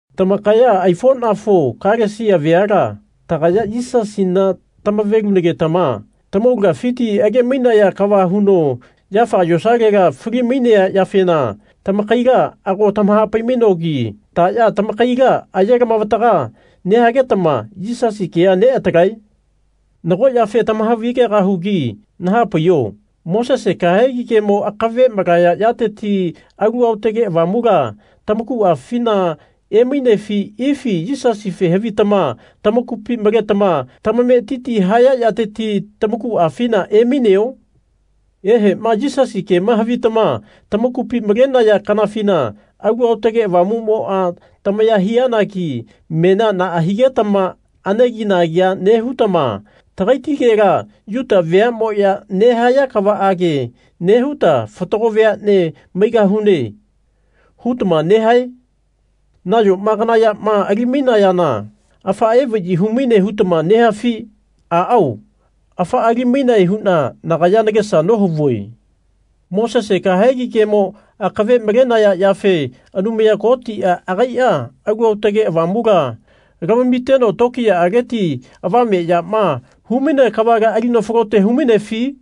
Tamakaya aifonafo Kalesia veala tagaya Yisasina tamavelunagetama tamaulagafiti age-mainaya kava huno yafaga yosalela fali-mainea yafena tamakaila ago tamahapai-mainogi taya tamakaila aye lamavataga nehagetama Yisasi kea neatalae? Nago yafe tamahavi-gegahugi nahapaiho Mosese kahegi kemo akave malaya yateti Alu Aotage Avamula tamakuafina emainefi ifi Yisasife havitama tamakupi maletama tamametiti haya yateti tamakuafina emaineo? Ehema Yisasi kema havitama tamakupi malenaya kanafina Alu Aotage Avamumoa tamaya hianagi menia naa higetama anegi-nagia nehutama Tagaitigela Yuta veamoya nehaya kavaage nehuta fatago veane maigahune. hutama nehae? Nayoma kana yama ali-mainayana afaa evayi humaine hutama nehafi? Aao afaa ali-mainae huna nagaya nagesa nohavue. Mosese kahegi kemo akave malenaya yafe Anumaya Kotia agaia Alu Aotage Avamula lamamiteno tokiyaaleti avameyama humainea kavala alino falote humainefi?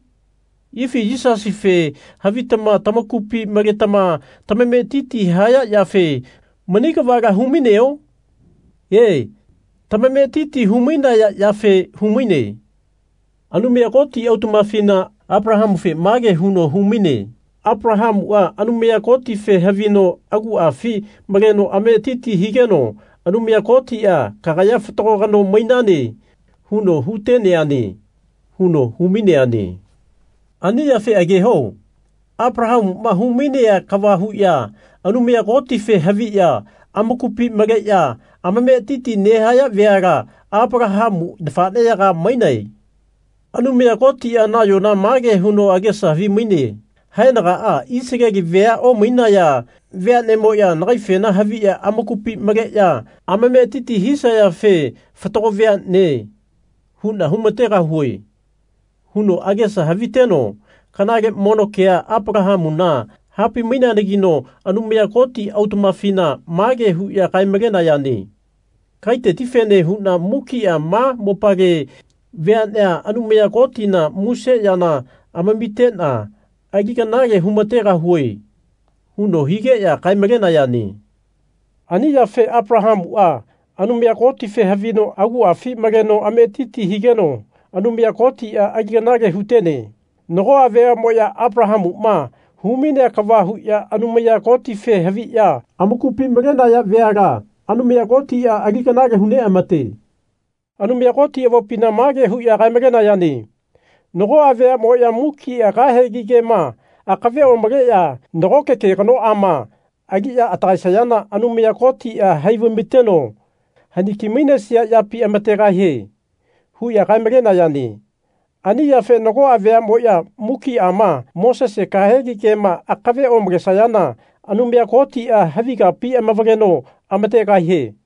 Ifi Yisasife havitama tamakupi maletama tamametiti haya yafe mani kavala hu-maineo? E, tamametiti hu-mainaya yafe humaine. Anumaya Koti autamafina Apalahamufe mage huno humaine Apalahamua Anumaya Kotife havino aguafi maleno ametiti higeno Anumaya Kotia Kagaya fatago kano mainane. huno huteneane. huno humaineane. Ani yafe ageho Apalahamuma humainea kava huya Anumaya Kotife haviya amakupi maleya amametiti nehaya veala Apalahamu nafaneyaga mainae. Anumaya Kotia nayona mage huno agesa havimaine Haenagaa Isaleli vea omainesaya veanemoya nagaifena haviya amakupi maleya amametiti hisayafe Fatago veane. huna humategahue. huno agesa haviteno kanale mono kea Apalahamuna hapai-maineanagino Anumaya Koti autamafina mage huya kae-maleneayane Kagaitetifene huna mukia ma mopale veanea Anumaya Kotina muse yana amamitena ali kanale humategahue. huno higeya kae-malenayane. Ani yafe Apalahamua Anumaya Kotife havino aguafi maleno ametiti higeno Anumaya Kotia ali kanale hutene. Nagoa veamoya Apalahamuma humainea kava huya Anumaya Kotife haviya amakupi malenaya veala Anumaya Kotia ali kanale hu neamate. Anumaya Koti avopina mage huya kae-malenayane Nagoa veamoya mukia kahegi kema akave omaleya nagoke ke kanoama aliya atagaesayana Anumaya Kotia hai vaimateno haniki-mainesia yapi amategahie. huya kae-malenayane. Ani yafe nagoa veamoya mukiama Mosese kahegi kema akave omalesayana Anumaya Kotia havi kapi amavaleno amategahie.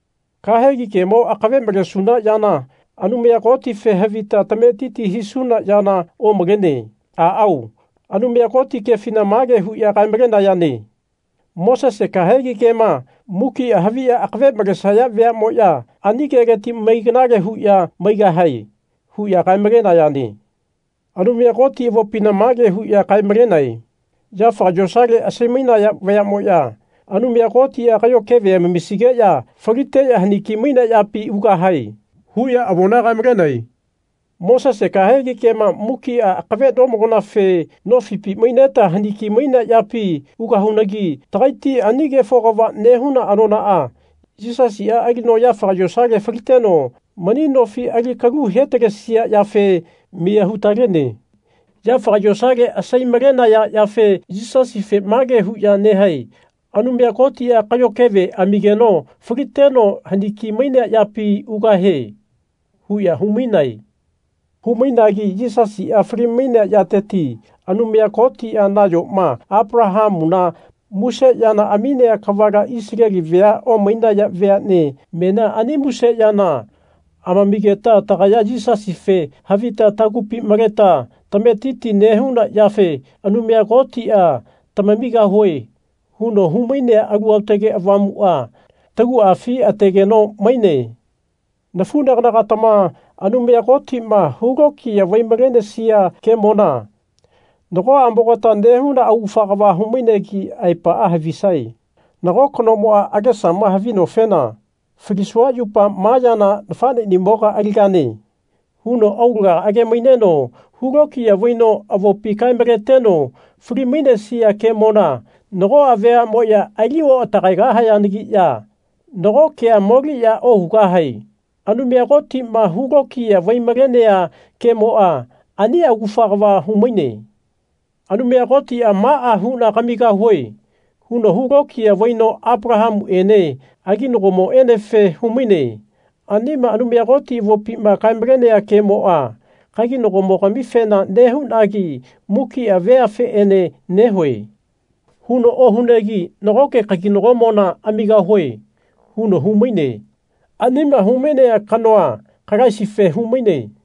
Kahegi kemo akave malesuna yana Anumaya Kotife havita tametiti hisuna yana omalene. Aao, Anumaya Koti kefina mage huya kae-malenayane Mosese kahegi kema mukia haviya akave malesaya veamoya ani keleti mai kanale huya maigahae. huya kae-malenayane. Anumaya Koti avopina mage huya kae-malenae Yafaga yosale asai-mainaya vayamoya Anumaya Kotia kayo keve amamisigeya faliteya haniki-mainea yapi ugahae. huya avona kae-malenae. Mosese kahegi kema mukia akave nomalonafe nofipi maineta haniki-mainea yapi ugahunagi tagaiti ani kefo kava nehuna anonaa Yisasia alino yafaga yosale faliteno mani nofi ali kalu hetalesia yafe miya hutalene. Yafaga yosale asai-malenaya yafe Yisasife mage huya nehae Anumaya Kotia kayo keve amigeno faliteno haniki-mainea yapi ugahie. huya hu-mainae. Humainagi Yisasia fali-mainea yateti Anumaya Kotia nayoma Apalahamuna muse yana aminea kavala Isaleli vea omainaya veane menia ani muse yana amamigeta tagaya Yisasife havita tagupi maleta tametiti nehuna yafe Anumaya Kotia Tamamigahue. huno humainea Alu Aotage Avamua taguafi tategeno maine. Nafunagana-gatama Anumaya Kotima hulokiya vai-malenesia kemona nagoamogata nehuna augafa kava humainegi aepaa havisae. Nago kanomoa agesama havinofena Falisua yupa ma yana nafanenimoga aligane. huno aulaga age-maineno hulokiya vaino avopi kae-maleteno fali-mainesia kemona nagoa veamoya ali oatagaegahayanagiya nago kea moliya ohugahae. Anumaya Kotima hulokiya vai-malenea kemoa ani augafa kava humaine. Anumaya Kotia Maa huna kamigahue. huno hulokiya vaino Apalahamuene aginagomoenefe humaine. Anima Anumaya Koti avopima kae-malenea kemoa Kaginagomogamifena nehunagi mukia veafeene nehue. huno ohunegi Nagoke kaginagomona amigahue. huno humaine. Anima humainea kanoa Kalaisife humaine.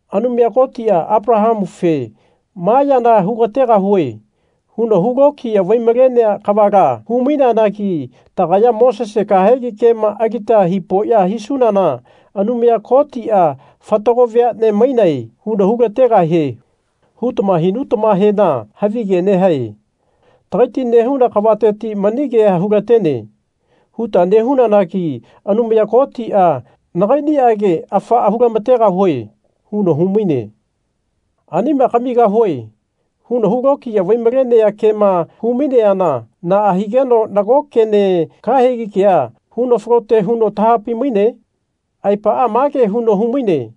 Anumaya Kotia Apalahamufe Ma yana hugategahue. huno hulokiya vai-malenea kavala humaineanagi tagaya Mosese kahegi kema alita hipoya hisunana Anumaya Kotia Fatago veane mainae. huno hulategahie hutama hinutamahena havige nehae. Takaiti nehuna kavateti mani kea hulatene. huta nehunanagi Anumaya Kotia Nagainiage afaa hulamategahue. huno humaine. Anima Kamigahue. huno hulokiya vai-malenea kema humaineana naa higeno nago kene, kahegi kea, huno falote huno tahapai-maine? Aepaa mage huno humaine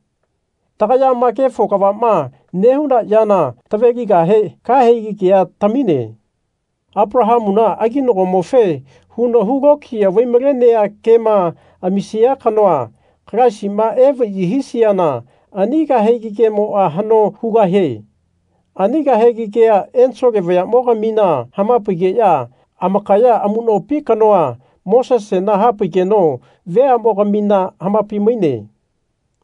tagayama kefo kavama nehuna yana taveligahe kahegi kea tamine. Apalahamuna aginagomofe huno hulokiya vaimalenea kema amisia kanoa Kalaisima evayi hisiana ani kahegi kemoa hano hugahie. Ani kahegi kea ensole vayamogamina hamapaigeya amakaya amunopi kanoa Mosesena hapaigeno veamogamina hamapai-maine.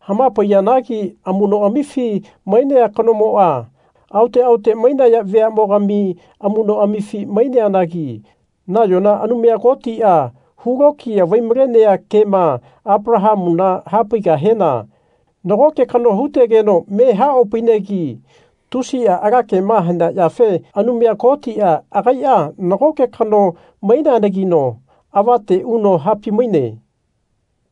Hamapaiyanagi amunoamifi mainea kanomoa aote aote mainaya vayamogami amunoamifi maineanagi nayona Anumaya Kotia hulokiya vaimalenea kema Apalahamuna hapaigahena nagoke kano hutegeno me haopainegi tusia ala kema hanea yafe Anumaya Kotia agaia nagoke kano maineanagino avate uno hapaimaine.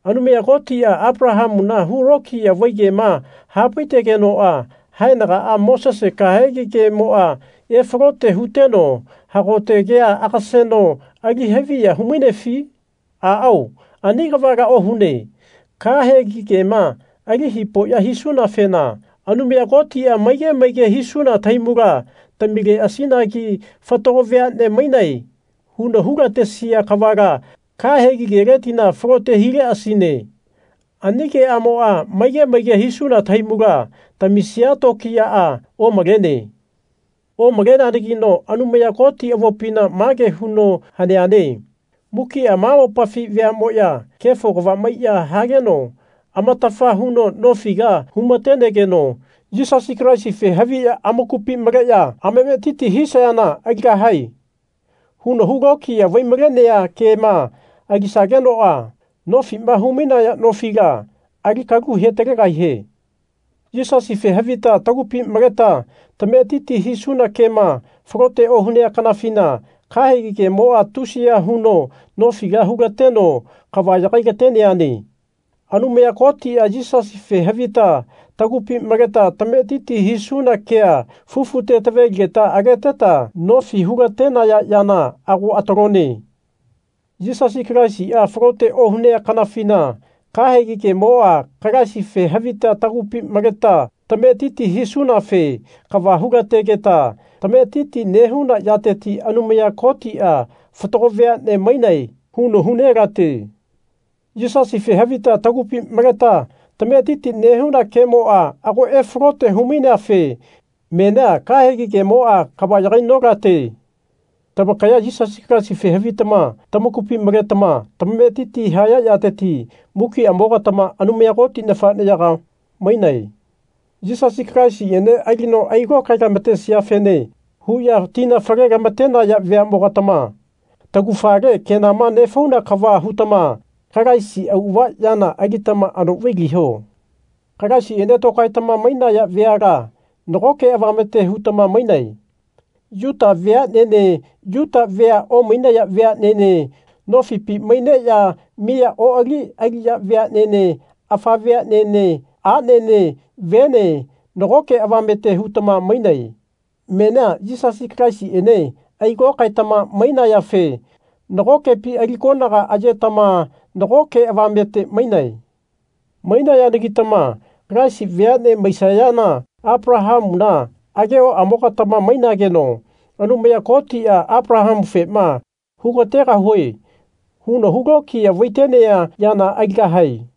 Anumaya Kotia Apalahamuna hulokiya vai kema hapaitegenoa haenaga Mosese kahegi kemoa efalote huteno hagote kea agaseno ali haviya humainefi? Aao, ani kavala ohune. Kahegi kema ali hipoya hisunafena Anumaya Kotia maige maige hisuna tahaimula tamileasinagi Fatago veane mainae. huno hulatesia kavala kahegi keletila falote hileasine ani keamoa maige maige hisuna tahaimula tamisia tokiyaa omalene. Omaleneanagino Anumaya Koti avopina mage huno haneane mukia ma mopafi veamoya kefo kava maiya hageno amatafa huno nofila humatenegeno Yisasi Kalaisife haviya amakupi maleya amametiti hisayana Aligahae. huno hulokiya vaimalenea kema alisagenoa nofima humainaya nofila alikalu hetalegahie. Yisasife havita tagupi maleta tametiti hisuna kema falote ohunea kanafina kahegi kemoa tusiya huno nofila hulateno kava yagai-lateneane. Anumaya Kotia Yisasife havita tagupi maleta tametiti hisuna kea fufute taveligeta ageteta nofi hulatenaya yana ago atalone. Yisasi Kalaisia falote ohunea kanafina kahegi kemoa Kalaisife havita tagupi maleta tametiti hisunafe kava hulategeta tametiti nehuna yateti Anumaya Kotia Fatago veane mainae. huno hunelate. Yisasife havita tagupi maleta tametiti nehuna kemoa ago efalote humaineafe menia kahegi kemoa kava yagai-nolate. Tamakaya Yisasi Kalaisife havitama tamakupi maletama tamametiti haya yateti mukiamo-gatama Anumaya Koti nafaneyaga mainae. Yisasi Kalaisiene alino ailokae-lamatesiafene huya tina fale-lamatenaya veamogatama taugafale kenama nefauna kava hutama Kalaisi auava yana alitama ano vailiho. Kalaisiene tokaetama mainaya veala nagoke avamete hutama mainae. Yuta veanene Yuta vea omainaya veanene, nofipi maineya miya oali aliya veanene afa veanene, anene vene nagoke avamete hutama mainae. Menia Yisasi Kalaisiene ailokaetama mainayafe nagokepi ali konaga ayetama nagoke avamete mainae. Mainayanagitama Kalaisi veane maisayana Apalahamuna agehoamogatama mainageno Anumaya Kotia Apalahamufema Hugategahue. huno hulokiya vaitenea yana aligahae.